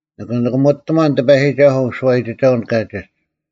ᓂᑭ ᓂᑭᒧᑎᒺᓐ ᑎᐸᔨᒋᒐᓱᐤ ᐅᓱᐛᔨᒋᒐᐅᓐ ᑲᒋᒡ: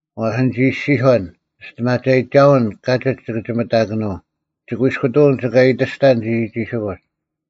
ᐛᔅ ᓂᒋ ᐃᔅᒋᔄᓐ, “ᒋᔅᑎᒪᒐᔨᒋᒐᐅᓐ ᑲᒋᒡ ᒋᑭ ᒋᒥᑕᑭᓄᐤ; ᒋᑯᐃᔅᑯᑐᐅᓐ ᒋᑭ ᐊᔨᑎᔅᑕᓐ ᒋᒋᒋᓯᑯᒡ᙮”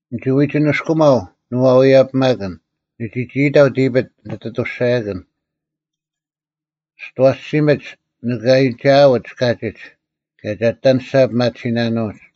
“ᓂᒋ ᐎᒋ ᓂᔅᑯᒪᐤ ᓂᐅᐛᔭᐱᒪᑭᓐ, ᓂ ᒋᒋ ᐃᑕᐤ ᑎᐱᑦ ᓂᑦ ᐊᑐᔅᒐᔭᑭᓐ, ‘ᒋᑦ ᐊᐛᓯᒥᓯᒡ ᓂᑭ ᐊᔨᒋᐊᐅᒡ ᑲᒋᒡ, ᑭᔭ ᒐ ᐊᑎ ᐊᓂᔅᒐ ᐱᒪᑎᓯᓇᓄᐅᒡ᙮’”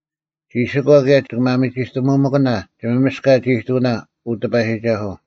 ᒋᓯᒂ ᑭᔭ ᒋᑭ ᒪᒥᒋᑐᑕᒧᒪᑭᓇ ᒋᒪᒥᔅᑲᒡ-ᐃᑐᐅᓇ, ᐅ ᑎᐸᔨᒋᒐᓱᐤ;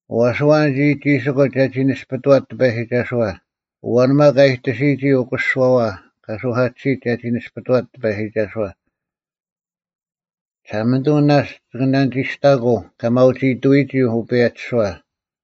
ᐛᔅ ᐊᐛᓐ ᒋᒋᒋᓯᑯᒡ ᒐᒋ ᓇᔅᐱᑐᐛᑦ ᑎᐸᔨᒋᒐᓱᐛ? ᐊᐛᓐ ᒪᒃ ᐊ ᐃᑎᓯᔨᒋ ᐅᑯᓯᓯᐛᐛ ᑲ ᓱᐧᑲᑎᓯᒡ ᒐᒋ ᓇᔅᐱᑐᐛᑦ ᑎᐸᔨᒋᒐᓱᐛ? ᒋᓴᒪᓂᑐᐤ ᓇᔅᒡ ᒋᑭ ᓇᓂᒋᔅᑕᑯᐤ ᑲ ᒪᐅᒋᐃᑐᔨᒋ ᐅᐸᔭᒋᓱᐛ,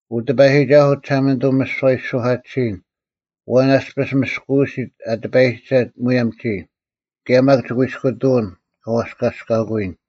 ᐅ ᑎᐸᔨᒋᒐᓱᐤ ᒋᓴᒪᓂᑐᐤ ᒥᓯᐛ ᐊ ᐃᓯ ᓱᐧᑲᑎᓯᔨᓐ, ᐊᐛᓐ ᐊᔅᐱᔅ ᒥᔅᑯᐅᓯᑦ ᐊ ᑎᐸᔨᒋᒐᑦ ᒧᔭᒻ ᒋᔾ? ᑭᔭ ᒪᒃ ᒋᑯᐃᔅᑯᑐᐅᓐ ᑲ ᐛᔅᑲᔅᑲᑯᔨᓐ?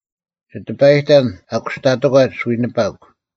ᒋ ᑎᐸᔨᑕᓐ ᐊ ᑯᔅᑕᑎᒂᒡ ᐎᓂᐸᒄ: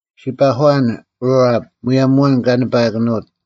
ᔅᒋ ᐱᒂᐊᓐ ᕋᐊᑉ, ᒧᔭᒻ ᐊᐛᓐ ᑲ ᓂᐸᐊᑭᓄᐅᑦ;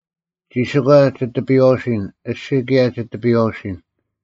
ᒋᓯᒂ ᒋ ᑎᐱᔨᐛᐅᓯᓐ, ᐊᔅᒋᔾ ᑭᔭ ᒋ ᑎᐱᔨᐛᐅᓯᓐ: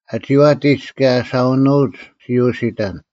ᐊ ᒋᐛᑎᒡ ᑭᔭ ᐊ ᓴᐅᓄᐊᒡ ᔅᒋ ᐅᓯᑕᓐ: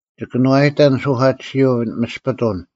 ᒋᑭᓄᐛᔨᑕᓐ ᓱᐧᑲᑎᓯᐅ-ᒥᔅᐱᑐᓐ: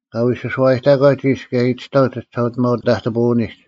ᑲ ᐎᓱᐛᐛᔨᑕᒂᒡ ᐃᔅ ᑭᔭ ᐃᑎᔅᑕᐤ ᒋᒋᓴᐅᒋᒪᐅ-ᑕᑎᐳᐛᓂᒡ: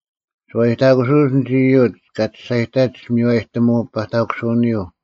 ᓱᐛᔨᑕᑯᓱᐅᒡ ᐊᓐᒡ ᐃᔪᒡ ᑲ ᒋᔅᒐᔨᑕᒡ ᒥᔽᑎᒧᐤ ᐸᑕᑯᓱᐅᓂᔪᐤ: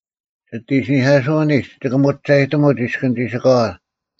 ᒋᑦ ᐃᓯᓂᐧᑲᓱᐅᓂᒡ ᒋᑭ ᒧᒐᔨᑎᒧᒡ ᐃᔅᑭᓐ ᒋᓯᑲᐛ: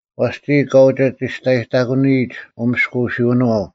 ᐛᔅ ᒋᔾ ᑲ ᐅᒋ ᒋᔅᑕᔨᑕᑯᓂᔨᒡ ᐅᒥᔅᑯᐅᓯᐅᓄᐛᐤ: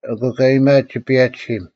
ᐊᑯ ᑲ ᐃᔨᒥᐊᑦ ᒋᐸᔭᒋᓯᒻ,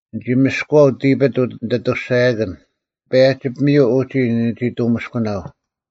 ᓂᒋ ᒥᔅᑯᐛᐤ ᑎᐱᑦ ᓂᑦ ᐊᑐᔅᒐᔭᑭᓐ; ᐸᔭᒋ ᐱᒥᔪᐤ ᐅᒋ ᓂᒋ ᑐᒥᔅᑯᓇᐤ;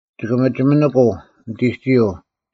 ᒋᑭ ᒥᒋᒥᓂᑯᐤ ᓂᑎᒋᔪᐤ;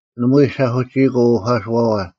ᓇᒪᐎᔾ ᓴᐧᑯᒋᐃᑯᐤ ᐅᐧᑲᓱᐛᐛ;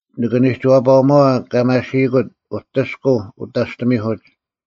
ᓂᑭ ᓂᒋᐛᐸᐅᒪᐛ ᑲ ᒪᓯᐃᑯᑦ ᐅᑎᔅᑯᐤ ᐅᑕᔅᑎᒥᐧᑯᒡ,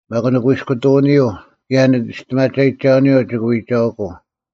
ᒪᒃ ᓂᑯᐃᔅᑯᑐᐅᓂᔪᐤ ᑭᔭ ᓂᒋᔅᑎᒪᒐᔨᒋᒐᐅᓂᔪᐤ ᒋᑭ ᐎᒐᐅᑯᐤ;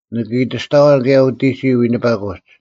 ᓂᑭ ᐃᑎᔅᑕᐛᓐ ᑭᔭ ᐅᑎᒋᔾ ᐎᓂᐸᑯᒡ,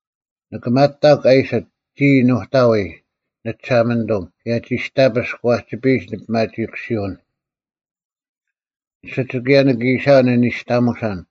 ᓂᑭ ᒪᑕᒄ ᐊ ᐃᓯᑦ, ‘ᒋᔾ ᓄᑕᐎᔾ, ᓂᒋᓴᒪᓂᑐᒻ, ᑭᔭ ᒋᔅᑕᐱᔅᒄ ᐛᒋᐱᔨᒡ ᓂᐱᒪᒋᐃᑯᓯᐅᓐ᙮’ ᐊᓯᒡ ᑭᔭ ᓂᑭ ᐃᓯᐊᐤ ᓂᓂᔅᑎᒧᓴᓐ,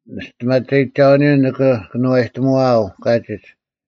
ᓂᒋᔅᑎᒪᒐᔨᒋᒐᐅᓂᔪᐤ ᓂᑭ ᑭᓄᐛᔨᑎᒧᐛᐤ ᑲᒋᒡ,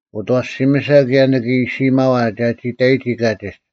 ᐅᑦ ᐊᐛᓯᒥᓴ ᑭᔭ ᓂᑭ ᐃᓯᐃᒪᐛ ᒐᒋ ᑕᔨᒋ ᑲᒋᒡ,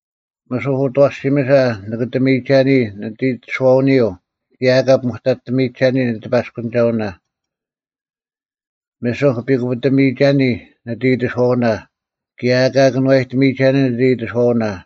ᒥᓱᒄ ᐅᑦ ᐊᐛᓯᒥᓴ ᓂᑭᑕᒥᔨᒐᓂ ᓂᑦ ᐃᑎᓱᐛᐅᓂᔪᐤ, ᑭᔭ ᐊᑲ ᐱᒧᑕᑎᒥᔨᒐᓂ ᓂᑎᐸᔅᑯᓂᒐᐅᓇ; ᒥᓱᒄ ᐱᑯᐱᑕᒥᔨᒐᓂ ᓂᑦ ᐃᑎᓱᐛᐅᓇ, ᑭᔭ ᐊᑲ ᑭᓄᐛᔨᑎᒥᔨᒐᓂ ᓂᑦ ᐃᑎᓱᐛᐅᓇ;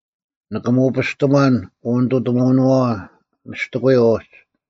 ᓂᑭ ᒧᐱᔅᑎᒺᓐ ᐅᐅᓂᑐᑎᒧᐅᓄᐛᐛ ᒥᔅᑎᑯᔪᐤ ᐅᒡ,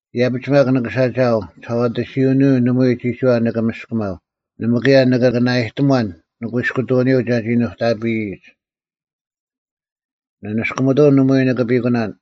ᐃᔭᐱᒡ ᒪᒃ ᓂᓴᒋᐃᐛᐤ ᒋᓴᐛᑎᓯᐅᓂᔪᐤ ᓇᒪᐎᔾ ᒋᒋᐛ ᓂᑭ ᒥᔅᑭᒪᐤ, ᓇᒪ ᑭᔭ ᓂᑭ ᓇᐃᑎᒺᓐ ᓂᑯᐃᔅᑯᑐᐅᓂᔪᐤ ᒐᒋ ᓄᑕᐱᔨᒡ᙮ ᓂᓂᔅᑯᒥᑐᐅᓐ ᓇᒪᐎᔾ ᓂᑭ ᐱᑯᓇᓐ,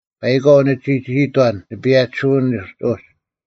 ᐸᐃᒂᐤ ᓂᒋ ᒋᒋᐃᑥᓐ ᓂᐸᔭᒋᓯᐅᓂᒡ ᐅᒡ,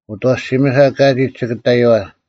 ᐅᑦ ᐊᐛᓯᒥᓴ ᑲᒋᒡ ᒋᑭ ᑕᔪᐛ,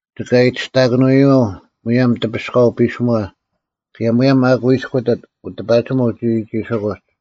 ᒋᑭ ᐊᔨᑎᔅᑕᑭᓄᐎᔪᐤ ᒧᔭᒻ ᑎᐱᔅᑲᐤ ᐱᓯᒺ, ᑭᔭ ᒧᔭᒻ ᑲ ᑯᐃᔅᑯᑎᑦ ᐅᑎᐸᒋᒧᐤ ᒋᒋᒋᓯᑯᒡ᙮”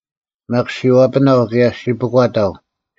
ᒪᒃ ᔅᒋ ᐛᐱᓇᐤ ᑭᔭ ᔅᒋ ᐱᒂᑕᐤ,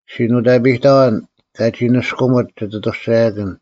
ᔅᒋ ᓄᑕᐱᔨᑕᐛᓐ ᑲᒋ ᓂᔅᑯᒥᑦ ᒋᑦ ᐊᑐᔅᒐᔭᑭᓐ: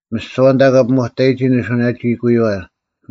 ᒥᓯᐛ ᐊᓐᑕ ᑲ ᐱᒧᑕᔨᒋ ᓂᓱᐅᓇᒋᐃᑯᐎᐛ: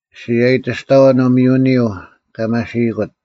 ᔅᒋ ᐊᔨᑎᔅᑕᐛᓐ ᐅᒥᔪᓂᔪᐤ ᑲ ᒪᓯᔨᑯᑦ;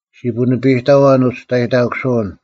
ᔅᒋ ᐳᓂᐸᔨᑕᐛᓐ ᐅᒋᔅᑕᔨᑕᑯᓱᐅᓐ,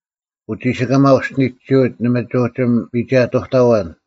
ᐅᒋᓯᑲᒪ ᐊ ᐅᔅᒋᓂᒋᐅᑦ ᓇᒪ ᒋ ᐅᒋ ᒥᒐᑐᑕᐛᓐ;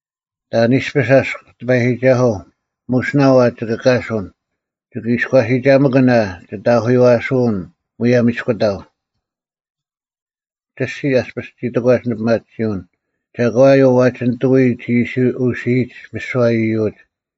ᑕᓐ ᐃᔅᐱᔅ ᐊᔅᒄ, ᑎᐸᔨᒋᒐᓱᐤ? ᒧᓯᓇᐤ ᐊ ᒋᑭ ᑲᓱᓐ? ᒋᑭ ᐃᔎᓯᒐᒪᑭᓐ ᐊ ᒋᑦ ᐊᐧᑯᔪᐛᓯᐅᓐ ᒧᔭᒻ ᐃᔅᑯᑕᐤ? ᒋᔅᒋᓯ ᐊᔅᐱᔅ ᒋ ᑕᒂᒡ ᓂᐱᒪᑎᓯᐅᓐ, ᒐᒂᔪᐤ ᐛᒋ ᓂᑐᐎ ᒋ ᐃᓯ ᐅᓯᐃᒡ ᒥᓯᐛ ᐃᔪᒡ?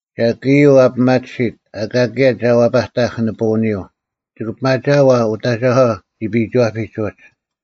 ᒐᒃ ᐃᔪᐤ ᐊ ᐱᒪᑎᓯᑦ, ᐊᑲ ᑭᔭ ᒐ ᐛᐸᑕᐧᒃ ᓂᐳᐅᓂᔪᐤ? ᒋᑭ ᐱᒪᒋᐊᐤ ᐊ ᐅᑦ ᐊᒐᒂ ᒋᐱᐃᒋᐛᐱᒡ ᐅᒡ?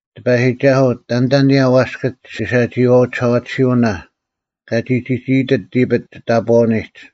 ᑎᐸᔨᒋᒐᓱᐤ, ᑕᓐᑕ ᐊᓂᔭ ᐛᔅᑭᒡ ᒋᓴᒋᐃᐛᐅ-ᒋᓴᐛᑎᓯᐅᓇ, ᑲᒋ ᒋᒋ ᐃᑎᑦ ᑎᐱᑦ ᒋᑕᑈᐅᓂᒡ?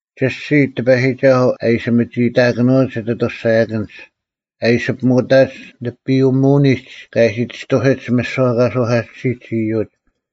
ᒋᔅᒋᓯ, ᑎᐸᔨᒋᒐᓱᐤ, ᐊ ᐃᓯ ᒪᒋ ᐃᑕᑭᓄᐅᒡ ᒋᑦ ᐊᑐᔅᒐᔭᑭᓐᒡ; ᐊ ᐃᓯ ᐱᒧᐅᑕᐅᒡ ᓂᐱᔪᒧᐅᓂᒡ ᑲ ᐃᓯ ᒋᔅᑐᓯᒡ ᒥᓯᐛ ᑲ ᓱᐧᑲᑎᓯᒡ ᐃᔪᒡ;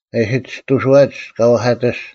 ᑲ ᐃᓯ ᒋᔅᑐᓱᐛᒡ ᑲ ᐛᐧᑲᑎᔅᒡ;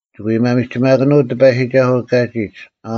ᒋᑭ ᐎ ᒪᒥᒋᒪᑭᓄᐤ ᑎᐸᔨᒋᒐᓱᐤ ᑲᒋᒡ᙮